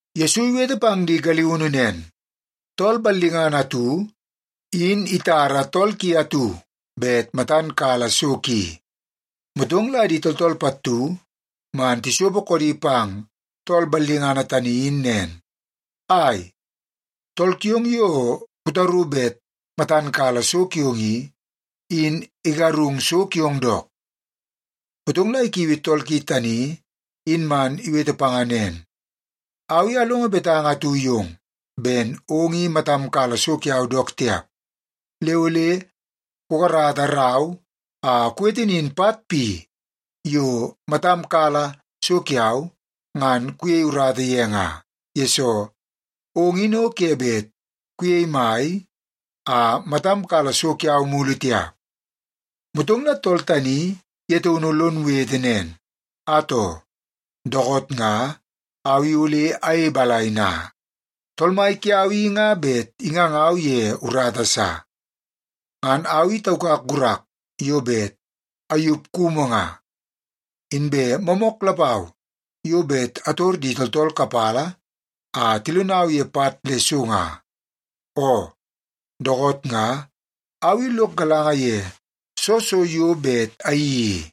Yesu iwete pang di galiunu nen, “Tool ballingana atu, in itara tool ki atu bet matan kala so ki. Motong la di tooltool pattu man tisopo koodi pang tool ballingana tani in nen, ‘Ai, tool kiong yo kutaru bet matan kala so kiong i, in igarung so kiong dook.’ Motong la ikiui tool ki tani in man iwete panga nen, ‘Au i alongo betanga atu yong ben ong i matam kala so kiau dook tiap. Le ole kukarata rau a kuwete nin pat pi yo matam kala so kiau ngan kuyei urata ye nga, yesoo ong in o ke bet kuyei mai a matam kala so kiau mulu tiap.’ “Motong la tool tani ye taunu lon wetewete nen, ‘Atoo, dookoot nga au i ole ayei balai na? Tool mai kiau i nga bet ingangau ye urata sa. Ngan au i taukak gurak yo bet ayup kumu nga. Inbe moomook lapau yo bet ator di tooltool kapala a tilonau ye pat le so nga. Oo, dookoot nga au i lok galanga ye soo so yo bet ayeii i,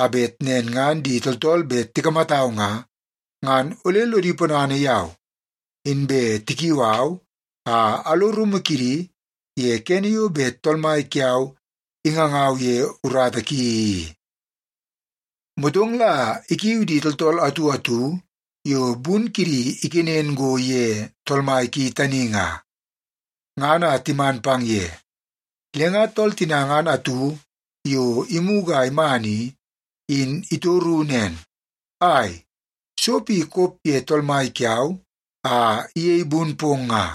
a bet nen ngan di tooltool bet tikamatau nga, ngan ole lodi ponana yau inbe tikiu au a alo rumu kidi ye kene yo bet tool mai kiau ingangau ye urata ki i.’ “Motong la ikiu di tooltool atu atu yo bun kidi ikenen go ye tool mai ki tani nga, ngan a timan pang ye. Le nga tool tina ngan atu yo imugu a iman i, in itoru nen, ‘Ai, so pi kop ye tool mai kiau a iyei bun pong nga?’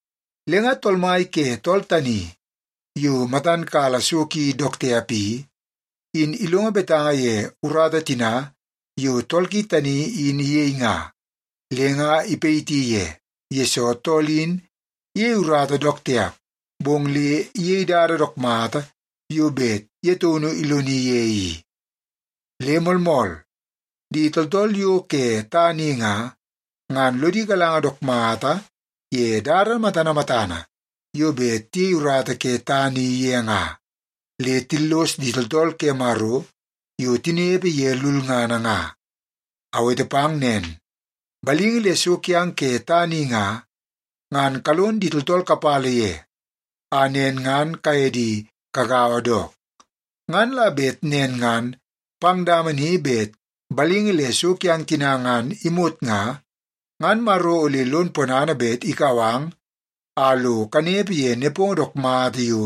“Le nga tool mai ke tool tani yo matan kala so ki dook tiap i, in ilongo betanga ye urata tina yo tool ki tani in iyei nga, le nga ipayiti ye, yesoo tool in iyei urata dook tiap, bong le iyei dada dook mata yo bet ye taunu iloni ye i. Le moolmool, di tooltool yo ke tana i nga, ngan lodi galanga dook mata ye dada matana matana yo bet tiyei urata ke tana i ye nga, le tillos di tooltool ke Maro yo tinepe ye lulngana nga. Awete pang nen, balingi le so kiang ke tana i nga, ngan kalon di tooltool kapala ye, a nen ngan kaye di kagaua dook. Ngan la bet nen ngan pang dama ni bet balingi le so kiang tina ngan imot nga, ngan Maro ole lon ponana bet ikau ang a lo kanepe ye nepongo dook mata yo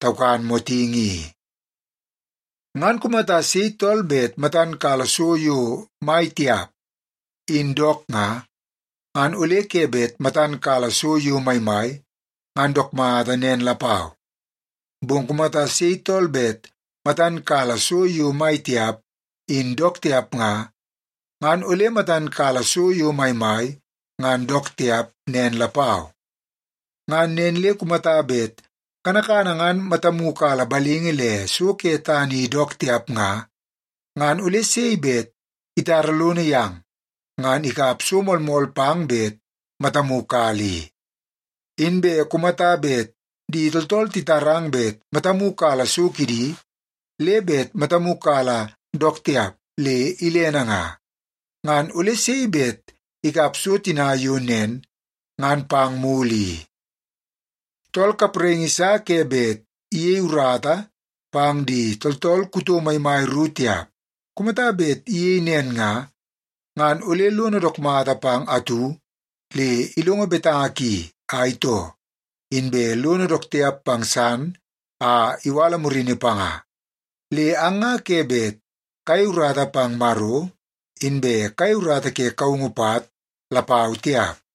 taukan motingi i. “Ngan kumata sei tool bet matan kala so yo mai tiap, in dook nga, ngan ole ke bet matan kala so yo maimai, ngan dook mata nen lapau. Bong kumata sei tool bet matan kala so yo mai tiap, in dook tiap nga, ngan ole matan kala so yo maimai, ngan dook tiap nen lapau. Ngan nen le kumata bet kanakana ngan matamu kala balingi le so ke tana i dook tiap nga, ngan ole sei bet itara lono yang ngan ikap so moolmool pang bet matamu kala i? Inbe kumata bet di tooltool titarang bet matamu kala so kidi, le bet matamu kala dook tiap le ilene nga, ngan ole sei bet ikap so tina yo nen ngan pang mulu i? “Tool kapraingi sa ke bet iyei urata pang di tooltool kuto maimai ru tiap. Kumata bet iyei nen nga, ngan ole lono dook mata pang atu le ilongo betanga ki a itoo, inbe lono dook tiap pang san a iwala murini panga. Le ang nga ke bet kayei urata pang Maro, inbe kayei urata ke kaungu pat lapau tiap.”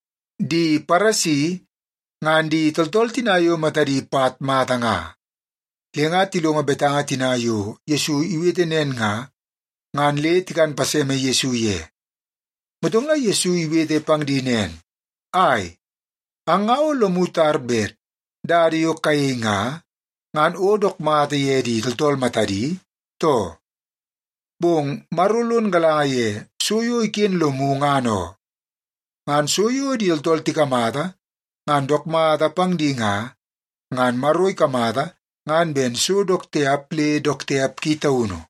Di Paresi ngan di tooltool tina yo matadi pat mata nga. Le nga tilongo betanga tina yo Yesu iwete nen nga, ngan le tikan paseme Yesu ye. Motong la Yesu iwete pang di nen, “Ai, ang nga o lomu tar bet dada yo kayei nga, ngan o dook mata ye di tooltool matadi, too? Bong Maro lon galanga ye so yo iken lomu, ngan oo. Ngan so yo di tooltool tikamata ngan dook mata pang di nga, ngan Maro ikamata ngan ben so dook tiap le dook tiap ki taunu.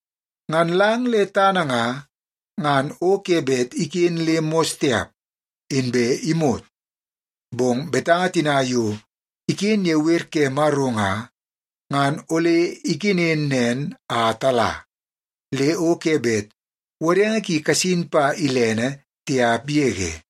Ngan lang le tana nga, ngan o ke bet iken le mos tiap, inbe imot. Bong betanga tina yo iken ye wer ke Maro nga, ngan ole ikenen nen a tala, le o ke bet wodenge ki kasin pa ilene tiap yege.”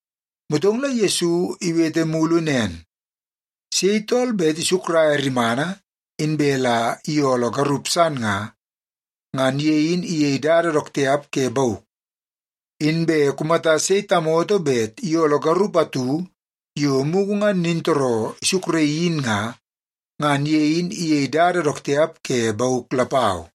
Motong la Yesu iwete mulu nen, “Sei tool bet isukraia rimana, inbe la iyooloo garup san nga, ngan ye in iyei dada dook tiap ke bauk. Inbe kumata sei tamoto bet iyooloo garup atu yo mugu ngan nintooroo isukraii in nga, ngan ye in iyei dada dook tiap ke bauk lapau.”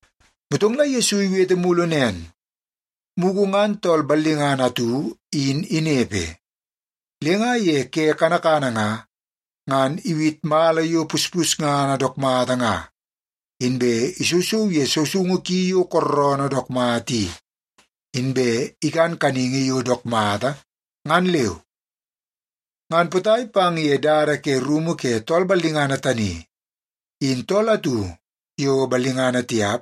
Motong la Yesu iwete mulu nen, “Mugu ngan tool ballingana atu in inepe. Le nga ye ke kanakana nga, ngan iwit mala yo puspusngana dook mata nga, inbe isousou ye sousoungu ki yo kooroonoo dook mata i, inbe ikan kaningi yo dook mata ngan leu. Ngan potai pang ye dada ke rumu ke tool ballingana tani, in tool atu yo ballingana tiap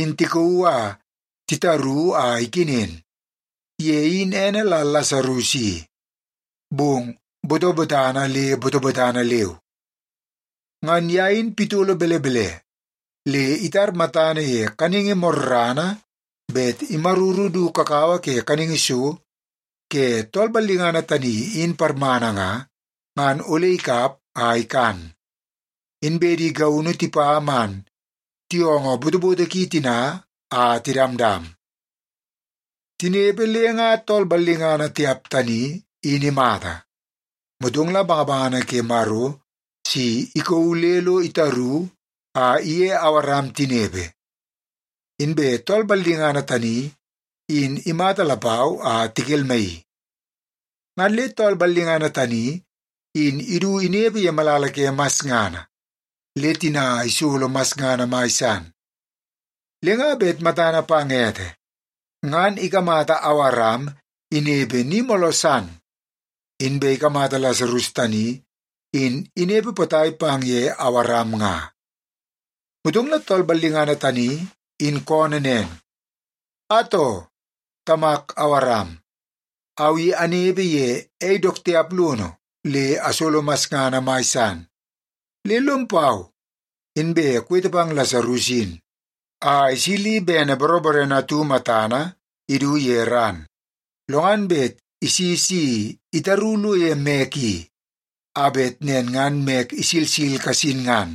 in tikauu a titaru a ikenen. Ye in ene la Lasarus i, bong botobotana le botobotana leu. Ngan ye in pitolo belebele le itar matana ye kaningi morrana bet imaruru du kakawa ke kaningi so ke tool ballingana tani in parmana nga, ngan ole ikap a ikan. Inbe di gaunu tipa man tiyoongoo botoboto ki tina a tidamdam. “Tinepe, le nga tool ballingana tiap tani, in imata. Motong la bangabangana ke Maro si ikauu le lo titaru a iye Awaram tinepe. Inbe tool ballingana tani, in imata lapau a tikelmaii. Ngan le tool ballingana tani in idu inepe ye malala ke masngana, le tina isolo masngana mai san. Le nga bet matana pang ete, ngan ikamata Awaram inepe ni mooloo san, inbe ikamata Lasarus tani in inepe potai pang ye Awaram nga. Motong la tool ballingana tani in koonoo nen, ‘Atoo, tamak Awaram, au i anepe ye ei dook tiap lono le asolo masngana mai san, le lom pau inbe kuwete pang Lasarus in a isili bene boroborene atu matana idu ye ran, lo ngan bet isi si itaru lo ye mek i, a bet nen ngan mek isilsil kasin ngan.’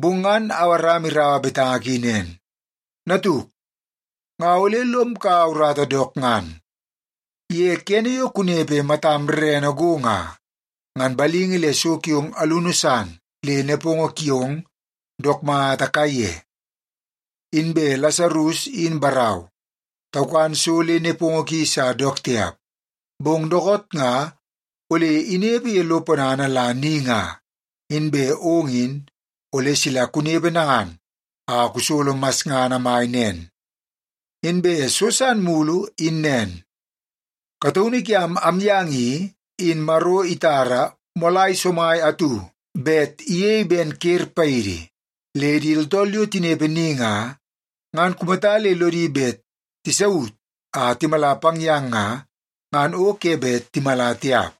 “Bong ngan Awaram iraua betanga ki nen, ‘Natuk, nga ole lom kaua urata dook ngan. Ye kene yo kunepe matam rerene go nga, ngan balingi le so kiong alunu san le nepongo kiong dook mata kaiye. Inbe Lasarus in barau taukan so le nepongo ki sa dook tiap. Bong dookoot nga ole inepe ye lo ponana la ni nga, inbe ong in ole sila kunepe nangan a kusolo masngana mai nen. Inbe so san mulu in nen, kataunu kiam amyang i, in Maro itara moolai somai atu bet iyei ben ker paidi. Le di tooltool yo tinepe ni nga, ngan kumata le lodi bet tisaut a timala pang yang nga, ngan o ke bet timala tiap.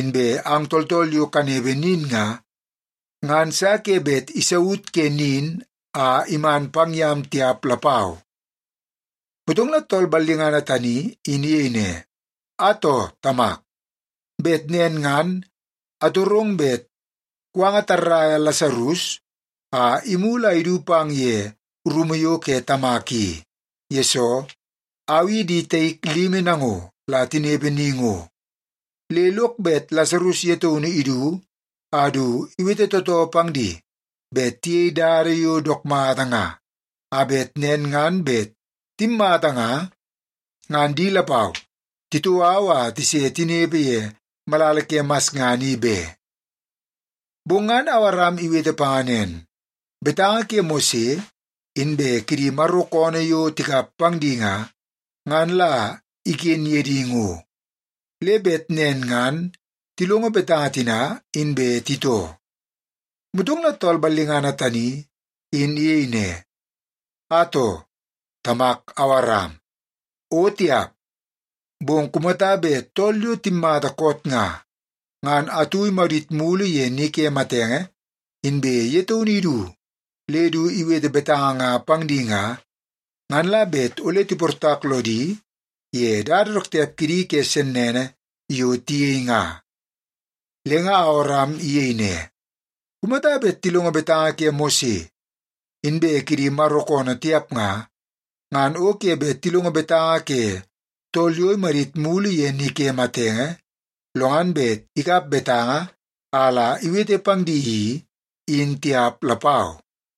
Inbe ang tooltool yo kanepe nin nga, ngan sa ke bet isaut ke nin a iman pang yam tiap lapau.’ “Motong la tool ballingana tani in iyei ne, ‘Atoo, tamak, bet nen ngan atorong bet kuwanga tarraia Lasarus a imulu a idu pang ye rumu yo ke tamak i, yesoo, au i di taik limi nango la tinepe ni ngo. Le lok bet Lasarus ye taunu idu a du iwete tootoo pang di bet tiyei dada yo dook mata nga, a bet nen ngan bet timmata nga, ngan di lapau titoo au a se tinepe ye malala ke masngana i be.’ “Bong ngan Awaram iwete panga nen, ‘Betanga ke Mose inbe kidi Maro koonoo yo tikap pang di nga, ngan la iken ye di ngo, le bet nen ngan tilongo betanga tina, inbe titoo.’ “Motong la tool ballingana tani in iyei ne, ‘Atoo, tamak Awaram, o tiap! Bong kumata bet tool yo timmata koot nga, ngan atu imadit mulu ye ni ke matenge, inbe ye taunu idu le du iwete betanga nga pang di nga, ngan la bet ole tiportak lodi ye dada dook tiap kidi ke sennene yo tiyei nga.’ “Le nga Awaram iyei ne, ‘Kumata bet tilongo betanga ke Mose inbe kidi Maro koonoo tiap nga, ngan o ke bet tilongo betanga ke tool yo imadit mulu ye ni ke matenge, lo ngan bet ikap betanga a la iwete pang di i, in tiap lapau.’”